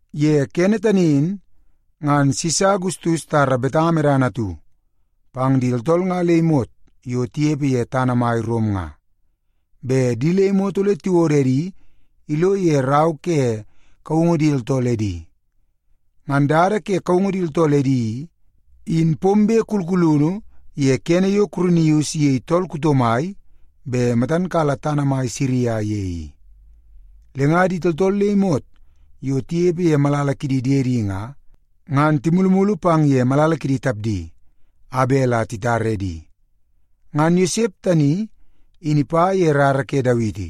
Ye kene tani in, ngan Sisa Agustus itara betanga medana atu pang di tooltool nga le imot yo tinepe ye tana mai Rom nga, bet di le imot ole tiwodo edi ilo ye rau ke kaungu di tooltool edi. Ngan dada ke kaungu di tooltool edi i, in pombe kulkulunu ye kene yo Kurinius iyei tool kuto mai bet matan kala tana mai Siria ye i. Le nga di tooltool le imot yo tinepe ye malala kidi diedi nga, ngan timulumulu pang ye malala kidi tapdi, a bet la titar edi. Ngan Yosep tani in ipa ye rara ke Dawiti.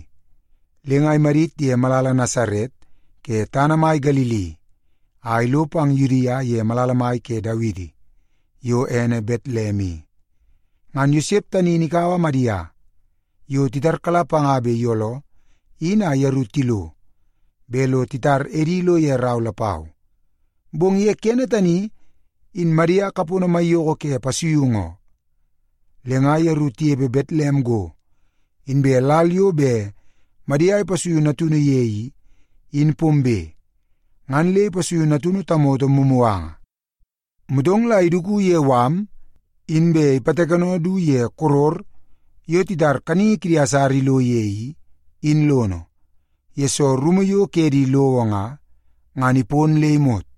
Le nga imadit ye malala Nasaret ke tana mai Galili a ilo pang Yudia ye malala mai ke Dawiti, yo ene Betlem i. Ngan Yosep tani in ikaua Madia, yo titarkala panga bet iyooloo, in a yeru tilo bet lo titar edi ilo ye rau lapau. Bong ye kene tani, in Madia kapono maiyoko ke pasuiungu oo. Le nga yeru tinepe Betlem go, inbe lal yo bet Madia ipasuiu natunu ye i, in pombe, ngan le ipasuiu natunu tamoto mumuganga. Motong la iduku ye mala, inbe ipatakeno du ye koror yo titar kaningi kidi asara ilo ye i, in lono, yesoo rumu yo ke di lowo nga, ngan ipon le imot.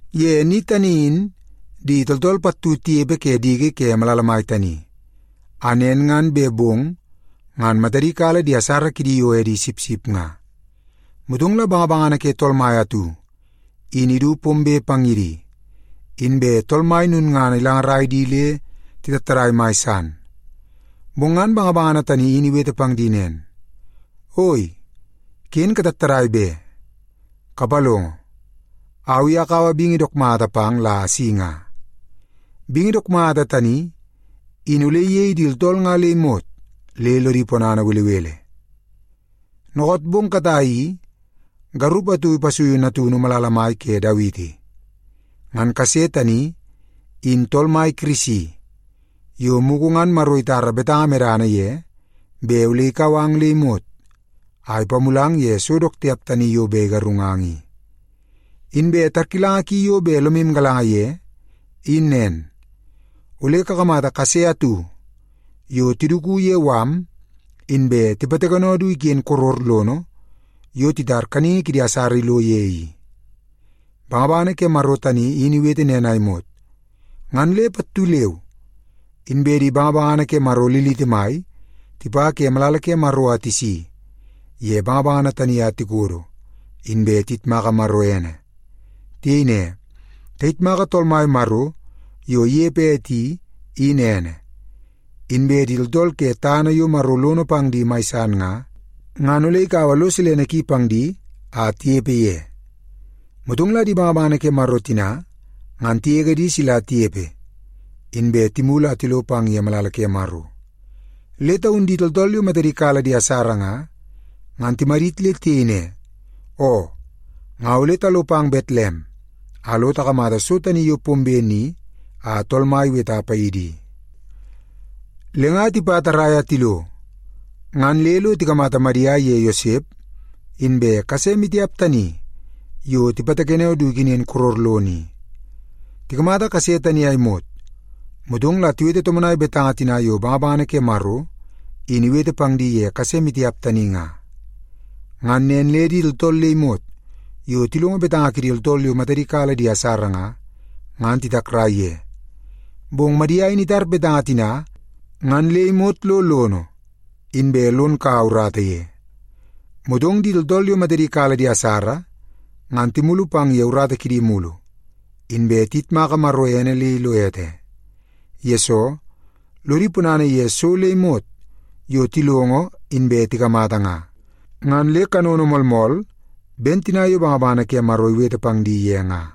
Ye ni tani in di tooltool pattu tinepe ke diki ke malala mai tani, a nen ngan bet bong ngan matadi kala di asara kidi yo edi sipsip nga. Motong la bangabangana ke Tool Mai atu in idu pombe pang ye di, inbe Tool Mai lulngana ilangarai di le titattadai mai san. Bong ngan bangabangana tani in iwete pang di nen, “Oi, ken katattadai be! Kapalongo, au i akaua bingi dook mata pang la asi nga. Bingi dook mata tani in ole iyei di tooltool nga le imot le lodi ponana belebele. Dookoot bong katai i, garup atu ipasuiu natunu malala mai ke Dawiti. Ngan kase tani in Tool Mai Kirisi yo mugu ngan Maro itara betanga medana ye bet ole ikau ang le imot a ipamulang ye so dook tiap tani yo bet igarungang i. Inbe tarkilanga ki yo bet lomu galanga ye, in nen. Ole kakamata kase atu yo tiduku ye mala, inbe tipatakeno du iken koror lono yo titar kaningi kidi asara ilo ye i.” Bangabangana ke Maro tani in iwete nen a imot, ngan le pattu leu inbe di bangabangana ke Maro liliti mai tipa ke malala ke Maro a tisi ye bangabangana tani a tikodo, inbe tiyitmaka Maro ene. Tiyei ne, “Tayitmaka Tool Mai Maro yo inepe ete i, in ene. Inbe di tooltool ke tana yo Maro lono pang di mai san nga, ngan ole ikaua lo silene ki pang di a tinepe ye.” Motong la di bangabangana ke Maro tina ngan tigege di sila tinepe, inbe timulu a tilo pang ye malala ke Maro. Le taun di tooltool yo matadi kala di asara nga, ngan timadit le tiyei ne, “Oo, nga ole talo pang Betlem a lo takamata so tani yo pombe ni a Tool Mai iweta paidi i.” Le nga tipa tarrai a tilo, ngan le lo tikamata Madia iye Yosep inbe kase maitiap tani yo tipatakeno du ikenen koror lono i. Tikamata kase tani a imot, motong la tiwete tomonai betanga tina yo bangabangana ke Maro in iwete pang di ye kase maitiap tani nga. Ngan nen le di tooltool le imot yo tilongo betanga kidi tooltool yo matadi kala di asara nga, ngan titakrai ye. Bong Madia in itar betanga tina ngan le imot lo lono, inbe lon kaua urata ye. Motong di tooltool yo matadi kala di asara ngan timulu pang ye urata kidi mulu, inbe tiyitmaka Maro ene le ilo ete. Yesoo, lodi ponana ye so le imot yo tilongo inbe tikamata nga, ngan le kanono moolmool ben tina yo bangabangana ke Maro iwete pang di ye nga.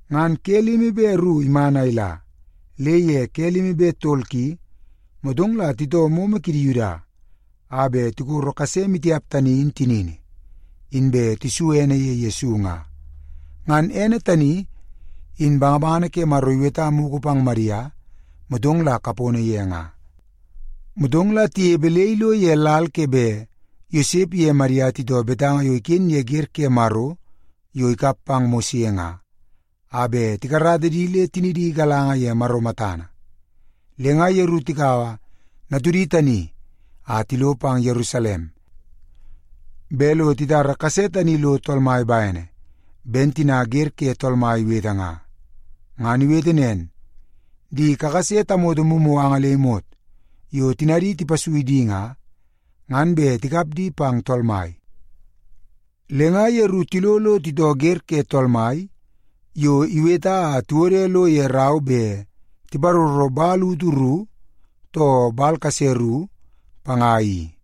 Ngan ke limi be ru iman a ila, le ye ke limi be tol ki, motong la titoo momo kidi Yuda a bet tikoro kase maitiap tani in tinini, inbe tisu ene ye Yesu nga. Ngan ene tani in bangabangana ke Maro iweta mugu pang Madia, motong la kapono ye nga. Motong la tinepe le ilo ye lal ke bet Yosep iye Madia titoo betanga yo iken ye wer ke Maro yo ikap pang Mose nga, a bet tikarata di le tinidi igalanga ye Maro matana. Le nga yeru tikaua natudi tani a tilo pang Yerusalem, bet lo titara kase tani lo Tool Mai bene, ben tina Wer ke Tool Mai iwete nga. Ngan iwete nen, “Di kakase tamoto mumuganga le imot yo tinadi tipasui di nga, ngan bet tikap di pang Tool Mai.” Le nga yeru tilo lo titoo Wer ke Tool Mai yo iweta a tiwode lo ye rau bet tiparoro “man utu ru, too man utu kase ru” panga i.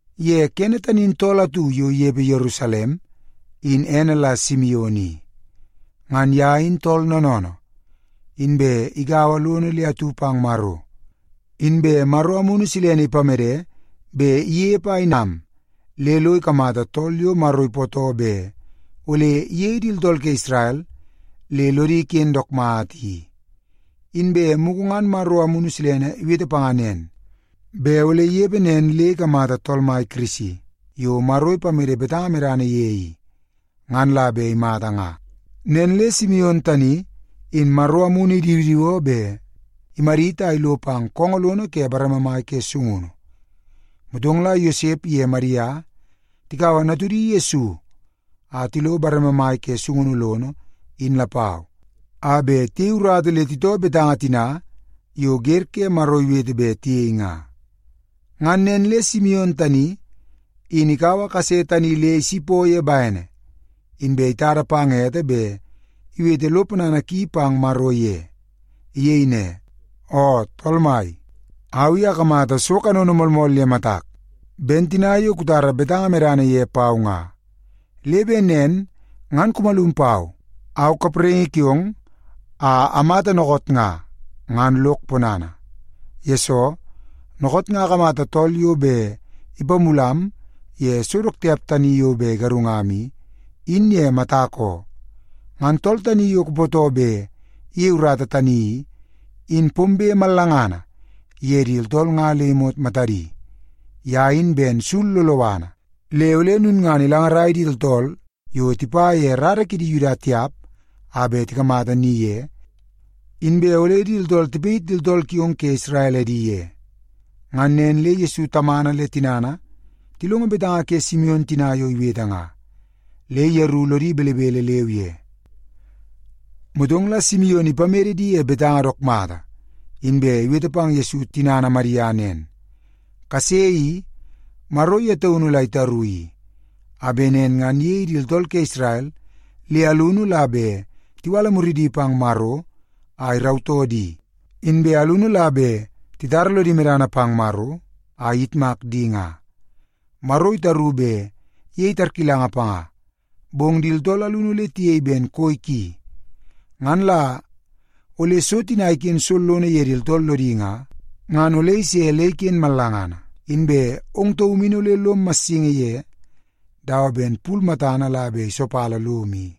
Ye kene tani in tool atu yo inepe Yerusalem, in ene la Simion i. Ngan ye in tool noonoonoo, inbe igaua lono le atu pang Maro. Inbe Maro Amunu Silene ipamede bet inepe a inam le lo ikamata tool yo Maro ipootoo bet ole iyei di tooltool ke Isrel le lodi iken dook mata i. Inbe mugu ngan Maro Amunu Silene iwete panga nen, bet ole inepe nen le ikamata Tool Mai Kirisi yo Maro ipamede betanga medana ye i, ngan la bet imata nga. Nen le Simion tani in Maro Amunu idiwidiwoo bet imadit a ilo pang koongoo lono ke bareme mai ke sungunu. Motong la Yosep iye Madia tikaua natudi Yesu a tilo bareme mai ke sungunu lono, in lapau, a bet tiyei urata le titoo betanga tina yo Wer ke Maro iwete bet tiyei nga. Ngan nen le Simion tani in ikaua kase tani le isipoo ye bene, inbe itada pang ete bet iwete lo ponana ki pang Maro ye. Iyei ne, “Oo Tool Mai, au i akamata so kanono moolmool ye matak, ben tina yo kutara betanga medana ye pau nga, le bet nen ngan kumalum pau, au kapraingi kiong, a amata dookoot nga, ngan lok ponana. Yesoo, dookoot nga akamata tool yo bet ipamulam ye so dook tiap tani yo bet igarungam i, in ye matak oo. Ngan tool tani yo kupootoo bet iyei urata tani i, in pombe mallangana ye di tooltool nga le imot matadi. Ye in ben sul loloana, le ole lulngana ilangarai di tooltool yo tipa ye rara kidi Yuda tiap nga a bet tikamata ni ye, inbe ole di tooltool tipayit di tooltool kiong ke Isrel edi ye.” Ngan nen le Yesu tamana le tinana tilongo betanga ke Simion tina yo iwete nga, le yeru lodi belebele leu ye. Motong la Simion ipamede di ye betanga dook mata, inbe iwete pang Yesu tinana Madia nen, “Kase i, Maro ye taunu la itaru i, a bet nen ngan iyei di tooltool ke Isrel, le alunu la bet tiwala muridi pang Maro a irautoo di, inbe alunu la bet titara lodi medana pang Maro a iyitmak di nga. Maro itaru bet iyei tarkilanga panga, bong di tooltool alunu ole tiyei ben koi ki. Ngan la ole so tina iken sollono ye di tooltool lodi nga, ngan ole ise le iken mallangana. Inbe ong taum in ole lom massingi ye dawa ben pul matana la bet isopala lom i.”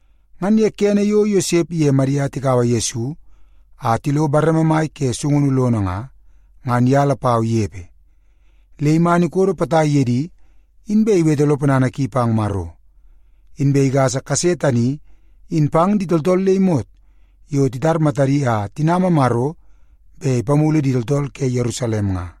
Ngan ye kene yo Yosep iye Madia tikaua Yesu a tilo bareme mai ke sungunu lono nga, ngan ye lapau inepe. Le iman ikodo potai ye di, inbe iwete lo ponana ki pang Maro. Inbe igasa kase tani in pang di tooltool le imot yo titar matadi a tinama Maro bet ipamulu di tooltool ke Yerusalem nga.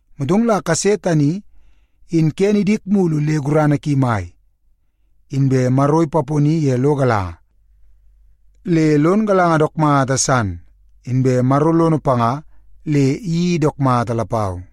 Motong la kase tani in kene idik mulu le gurana ki mai. Inbe Maro ipaponi ye lo galanga le lon galanga dook mata san, inbe Maro lono panga le iyeii dook mata lapau.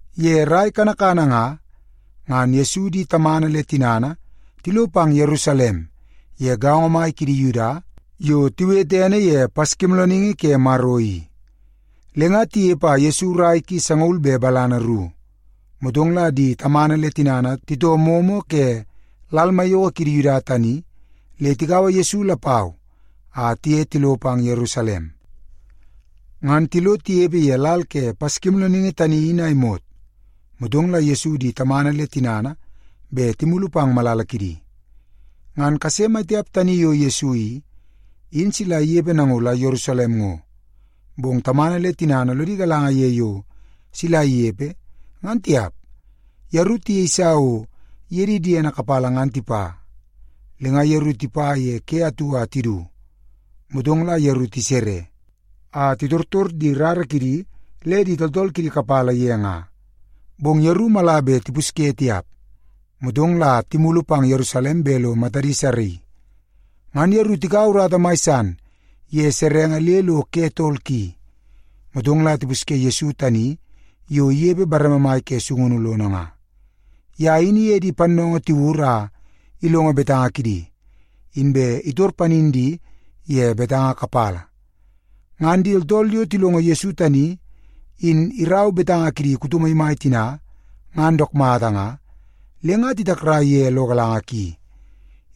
Ye rai kanakana nga, ngan Yesu di tamana le tinana tilo pang Yerusalem ye gaongo mai kidi Yuda yo tiwete ene ye Paskimoolooningi ke Maro i. Le nga tinepe a Yesu rai ki sangaul be balana ru, motong la di tamana le tinana titoo momo ke lal maiyoko kidi Yuda tani le tikaua Yesu lapau a tiye tilo pang Yerusalem. Ngan tilo tinepe ye lal ke Paskimoolooningi tani in a imot, motong la Yesu di tamana le tinana bet timulu pang malala kidi. Ngan kase mai tiap tani yo Yesu i, in sila inepe nango la Yerusalem ngo, bong tamana le tinana lodi galanga ye yo sila inepe, ngan tiap. Yeru tiyeisa o iye di diedi kapala ngan tipa. Le nga yeru tipa ye ke atu a tidu. Motong la yeru tisere, a titortor di rara kidi le di tooltool kidi kapala ye nga. Bong yeru mala bet tipusye tiap, motong la timulu pang Yerusalem bet lo matadi saraii. Ngan yeru tikaua urata mai san ye serenge le lo ke tol ki, motong la tipusye Yesu tani yo inepe bareme mai ke sungunu lono nga. Ye in iye di pannoongoo tiwur a ilongo betanga kidi, inbe itor panin di ye betanga kapala. Ngan di tooltool yo tilongo Yesu tani in irau betanga kidi kuto maimai tina ngan dook mata nga, le nga titakrai ye lo galanga ki.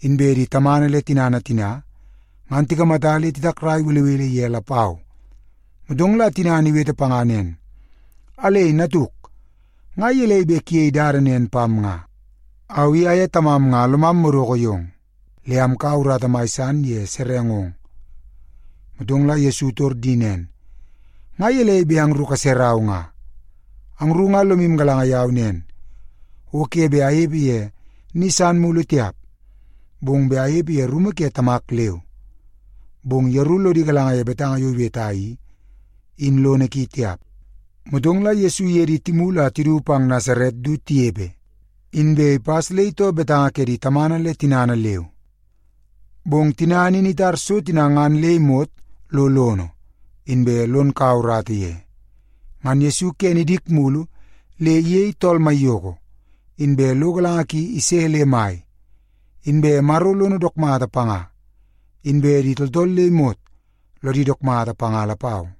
Inbe di tamana le tinana tina ngan tikamata le titakrai belebele ye lapau. Motong la tinana iwete panga nen, “Alei natuk, nga gelei bet kuyei dada nen pam nga? Au i aye tamam nga lomam madoko yong, le amkaua urata mai san ye serengong.” Motong la Yesu itor di nen, “Nga gelei bet angru kaserau nga? Angru nga lomu galanga yau nen o ke bet anepe ye ni san mulu tiap, bong bet anepe ye rumu ke Tamak leu.” Bong yeru lodi galanga ye betanga yo iweta i, in lono ki tiap. Motong la Yesu iye di timulu a tidu pang Nasaret du tinepe, inbe ipas le itoo betanga ke di tamana le tinana leu. Bong tinana in itar so tina ngan le imot lo lono, inbe lon kaua urata ye. Ngan Yesu kene idik mulu le iyei tool maiyoko, inbe lo galanga ki ise le mai. Inbe Maro lono dook mata panga, inbe di tooltool le imot lodi dook mata panga lapau.